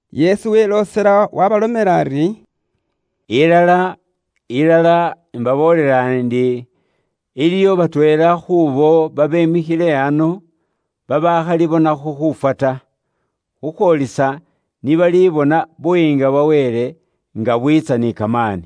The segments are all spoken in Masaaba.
Yesu weloosela waabalomela ari, “Ilala, ilala, imbaboolela indi, iliwo batweela khuubo babemikhile ano, babaakhalibonakho khuufwa ta, khukhwoolisa ni balibona Buyiinga bwa Wele, nga bwiitsa ni kamaani.”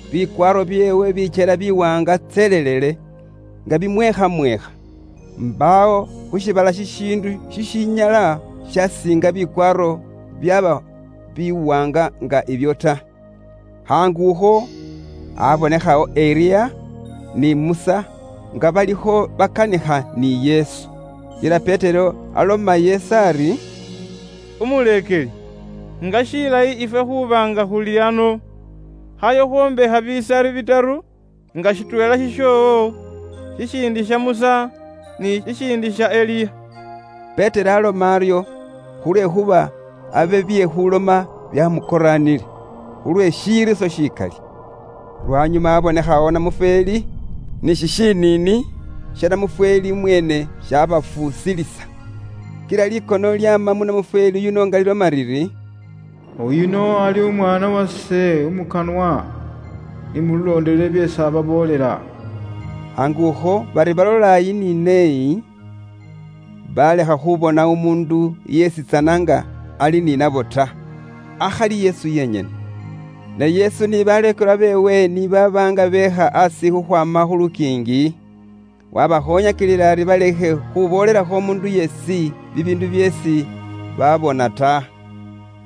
Bikwaaro byeewe byekyela biwaanga tselelele, nga bimweekhamweekha. Mbaawo khu shiibala shishiindu shishinyala shaasiinga bikwaaro byaaba biwaanga nga ibyo ta. Khaangukho abonekhawo Eliya ni Musa nga balikho bakanikha ni Yesu. Kila Petero aloma Yesu ari, “Umuleekeli, nga shilayi ifwe khuuba nga khuli ano! Khayo khwombakhe bisari bitaru, nga shitweela shishoowo, shishindi sha Musa, ni shishindi sha Eliya.” Petero aaloma aryo khulwekhuuba abe bye khuuloma byaamukoraanile, khulwe shiriiso shikali. Lwanyuma abonekhawo namufweeli, ni shishiniini sha namufweeli mweene shaabafuusilisa. Kila likono lyaama mu namufweeli yuno nga liloma liri, “Uyuno ali Umwaana wase umukanwa, ni mulondelele byeesi ababoolela.” Khaangukho bari balola iyi ni neeyi, baalekha khubona umuundu yeesitsana nga ali ni nabo ta, akhali Yesu yenyene. Ne Yesu ni baleekelwa beewe ni baaba nga beekha aasi khukhwaama khu lukiingi, waabakhoonyakilila ari balekhe khuboolelakho umuundu yeesi bibiindu byeesi baabona ta,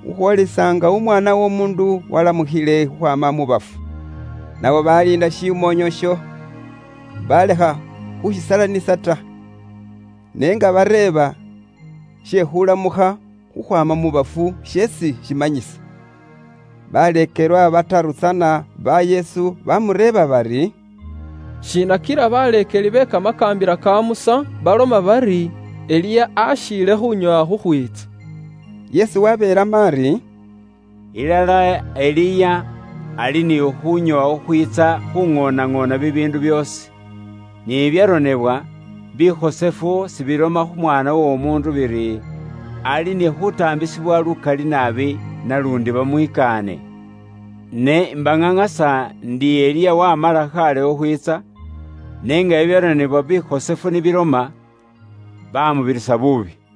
khukhwoolisa nga Umwaana w'Omuundu waalamukhile khukhwaama mu bafu. Nabo baaliinda shimoonyo isho, baalekha khushisalanisa ta, ne nga bereeba she khuulamukha khukhwaama mu bafu sheesi shimanyisa. Baleekelwa bataru tsana ba Yesu baamureeba bari, “Shiina kila baleekeli be Kamakaambila ka Musa baloma bari Eliya akhiile khuunyoowa khukhwiitsa?” Yesu wabeelamo ari: “Ilala Eliya ali ni khuunyoowa khukhwiitsa khuuŋoonaŋoona bibiindu byoosi. Ni bibyaronebwa bikhosefu sibiloma kh'Umwaana w'Omuundu biri, ali ni khuutaambisibwa lukali naabi naluundi bamwikaane? Ne imbaŋaŋasa ndi, Eliya waamala khaale khukhwiitsa, ne nga bibyaronebwa bikhosefu ni biloma, baamubirisa buubi.”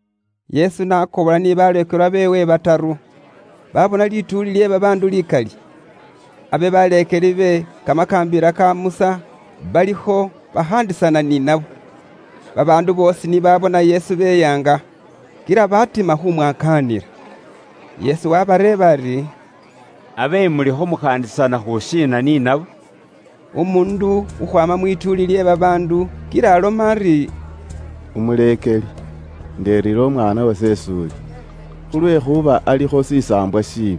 Yesu n'akobola ni baleekelwa beewe bataru, baabona lituuli lye babaandu likali. Abe baleekeli be Kamakaambila ka Musa balikho bakhaandisana ni nabo. Babaandu boosi ni baabona Yesu beyaanga, kila batima khu mwakaanila. Yesu waabareeba ari, “Abe mulikho mukhaandisana khu shiina ni nabo?” Umuundu khukhwaama mu lituuli lye babaandu kila aloma ari, “Umuleekeli, indeerire umwaana wase is'uli, khulwekhuuba alikho shisaambwa shiibi,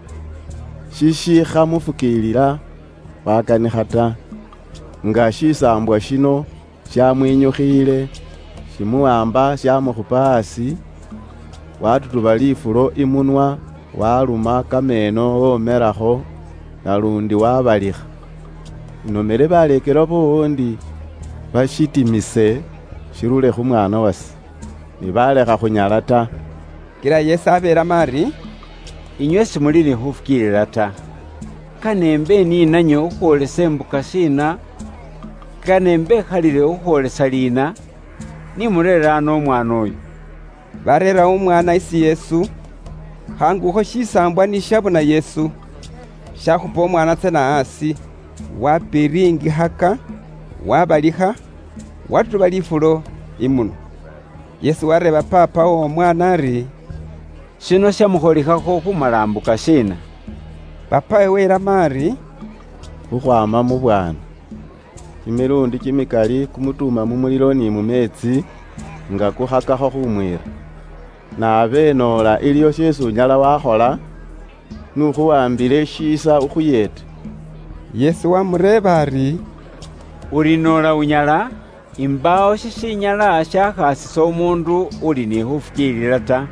shishikhamufukiilila wakanikha ta. Nga shisaambwa shino shaamwinyukhiile, shimuwaamba shaamukhupa aasi, waatutuba lifulo imunwa, waaluma kameeno woomelakho, naluundi waabalikha. Inomele baleekelwa boowo ndi bashitimise shirure khu mwaana wase, ne baalekha khunyala ta.” Kila Yesu abeelamo ari, “Inywe simuli ni khufukiilila ta! Kane imbe ni nanywe khukhwoolisa imbuka shiina? Kane imbekhalilikhe khukhwoolisa liina? Ni mureere ano umwaana uyo.” Baareera umwaana isi Yesu. Khaangukho shisaambwa ni shabona Yesu, shakhupa umwaana tsana aasi, wapiringikhaka, waabalikha, waatutuba lifulo imunwa. Yesu wareeba paapa w'omwaana ari, “Shino shaamukholikhakho khuumala imbuka shiina?” Paapawe welamo ari, “Khukhwaama mu bwaana. Kimiluundi kimikali kumutuuma mu mulilo ni mu meetsi, nga kukhakakho khumwiira. Ne abe noola iliwo sheesi unyala wakhola, n'ukhuwaambile shiisa ukhuyeete.” Yesu waamureeba ari, “Uri noola unyala? Imbaawo shishinyala shakhaasisa umuundu uli ni khufukiilila ta.”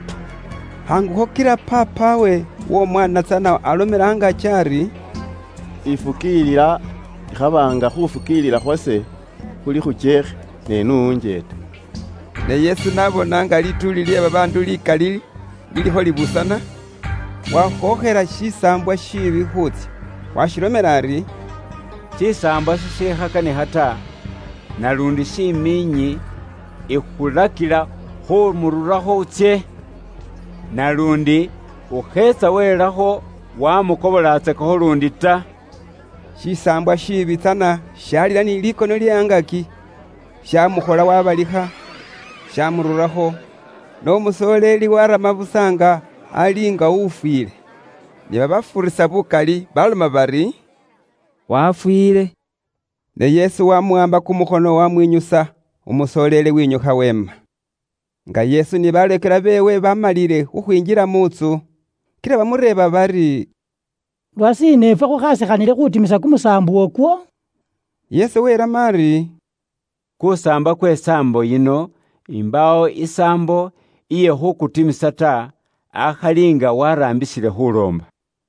Khaangukho kila paapawe w'omwaana tsana alomela angaaki ari, “Ifukiilila! Ikhaba nga khufukiilila khwase khuli khukyeekhe, ne n'unjeete.” Ne Yesu n'abona nga lituuli lye babaandu likali lilikho libuusana, wakhookhela shisaambwa shiibi khuutsya. Waashilomela ari, “Shisaambwa shishikhakanikha ta, naluundi shimiinyi, ikhulakila khuumururakho utsye. Naluundi ukheetsa welakho wamukobolatsakakho luundi ta.” Shisaambwa shiibi tsana shaalila ni likono lye angaaki, shaamukhola waabalikha, shaamururakho, ne umusoleeli waarama busa nga ali nga ufwiile. Ni babafuurisa bukali baaloma bari, “Wafwiile.” Ne Yesu waamuwaamba kumukhono waamwinyusa, umusoleeli wenyukha weema. Nga Yesu ni baleekelwa beewe baamalile khukhwinjila mu ntsu, kila bamureeba bari, “Lwashiina ifwe khukhaasikhanile khuutimisa kusaambwa ukwo?” Yesu welamo ari, “Kusaambwa kwe saambo yino imbaawo isaambo iye khuukutimisa ta, akhali nga waraambisile khuuloomba.”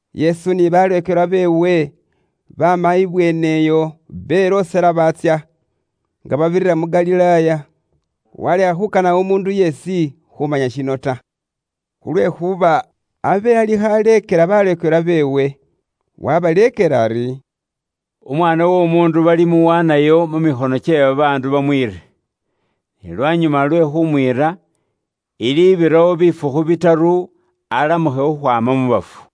Yesu ni baleekelwa beewe baama ibweene iyo belooselayo baatsya, nga babirira mu Galilaaya. Walekha khukana umuundu yeesi khumanya shino ta, khulwekhuuba abe alikho aleekela baleekelwa beewe. Wabaleekela ari, “Umwaana w'Omuundu balimuwaanayo mu mikhono kye babaandu bamwiire. Ne lwanyuma lwe khumwiira, ilibirawo bifukhu bitaru alamukhe khukhwaama mu bafu.”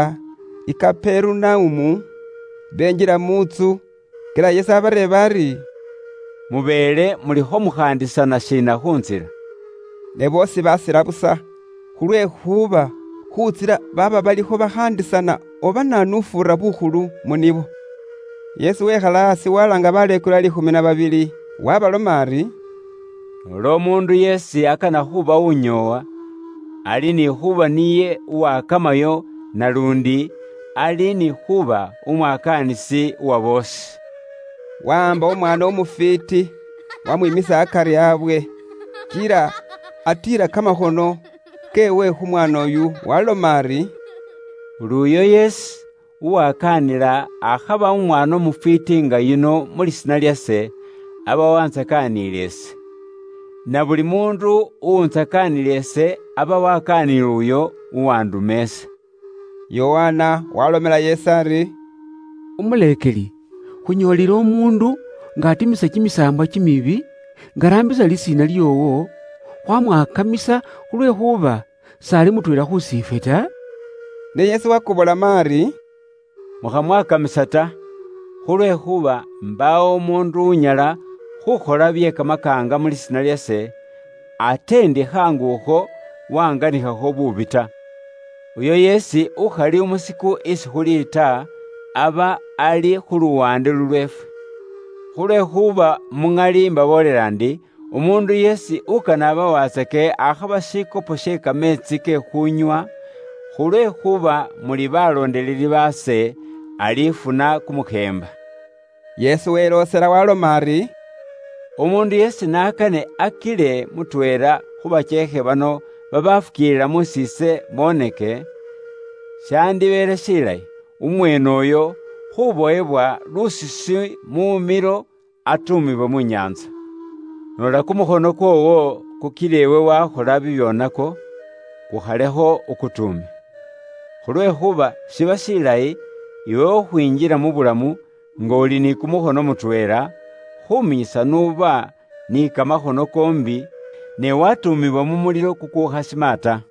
Ni boola i Kaperunaumu, benjila mu ntsu, kila Yesu abareeba ari, “Mubeele mulikho mukhaandisana shiina khu ntsila?” Ne boosi basila busa, khulwekhuuba khu ntsila baaba balikho bakhaandisana oba naanu ufuura bukhulu mu nibo. Yesu wekhala aasi walaanga baleekelwa liikhumi na babili, waabaloma ari, “Noola umuundu yeesi akana khuuba unyoowa, ali ni khuuba niye uwakamayo naluundi ali ni khuuba umwakaanisi uwa boosi.” Wahaamba umwaana umufwiiti wamwiimisa akari abwe. Kila atiila kamakhono keewe khu mwaana uyo waaloma ari, “Buli uyo yeesi uwakaanila akhaba umwaana umufwiiti nga yuno mu lisiina lyase, aba wantsakaanile ise. Na buli muundu uwuntsakanila ise, aba wakaaniile uyo uwanduma ise.” Yokana waalomela Yesu ari, “Umuleekeli, khunyoolile umuundu nga atimisa kimisaambwa kimibi nga araambisa lisiina lyoowo, khwamwakamisa khulwekhuuba s'ali mutweela khusi ifwe ta.” Ne Yesu wakobolamo ari, “Mukhamwakamisa ta; khulwekhuuba imbaawo umuundu unyala khuukhola bye kamakaanga mu lisiina lyase, ate ndi khaangu akho waanganikhakho buubi ta. Uyo yeesi ukhali umusiku isi khuli ta, aba ali khu luwaande lulweefwe. Khulwekhuuba ilala ise mbaboolela inywe ndi, umuundu yeesi ukane abawatsake akhaba shikopo she kameetsi ke khunywa, khulwekhuuba muli baloondeleli ba Kristo, alifuna kumukheemba.” Yesu weloosela waaloma ari, “Umuundu yeesi n'akane akile mutweela khu bakyeekhe bano babafukiilila mus'iise boneke, shaandibeele shilayi umweene uyo khuubowebwa lusisi mumilo atuumibwe mu nyaantsa. Noola kumukhono kwoowo kukila iwe waakhola bibyoonako, kukhalekho ukutuume. Khulwekhuuba shiba shilayi iwe khukhwinjila mu bulamu nga uli ni kumukhono mutweela, khuminyisa n'uba ni kamakhono koombi ne watuumibwa mu mulilo kukukhasima ta.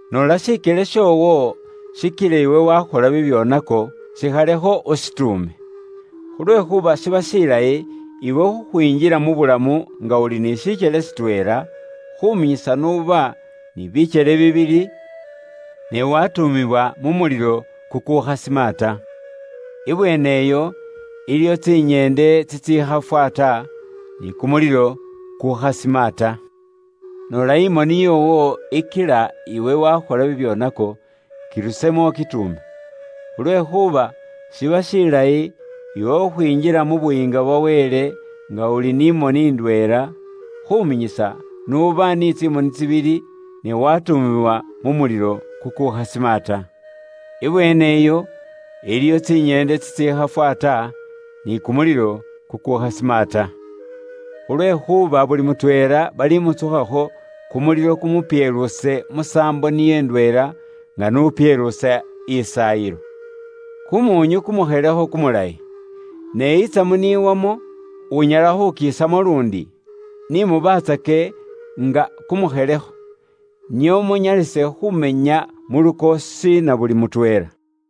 Noola shikyele shoowo shikila iwe waakhola bibyoonako, shikhalekho ushituume. Khulwekhuuba shiba shilayi iwe khukhwinjila mu bulamu nga uli ni shikyele shitweela, khuminyisa n'uba ni bikyele bibili, ne watuumibwa mu kumulilo kukukhasima ta. Ibweene iyo iliyo tsinyeende tsitsikhafwa ta, ni kumulilo ku khasima ta. Noola imoni yoowo ikila iwe wakhola bibyoonako, kirusemo ukituume. Khulwekhuuba shiba shilayi iwe khukhwinjila mu Buyiinga bwa Wele nga uli ni moni indweela, khuminyisa n'uba ni tsimoni tsibili, ne watuumibwa mu mulilo kukukhasima ta. Ibweene iyo iliyo tsinyeende tsitsikhafwa ta, ni kumulilo kukukhasima ta. Khulwekhuuba buli mutweela balimutsukhakho kumulilo kumupyeluuse musaambo niyo ndweela nga n'upyeluusa isaayilo. “Kumuunyu kumukhelekho kumulayi; ne itsamu n'iwamo, unyala khukisamo luundi? Ni mubaatsake nga kumukhelekho, nio munyalise khumenya mu lukoosi na buli mutweela.”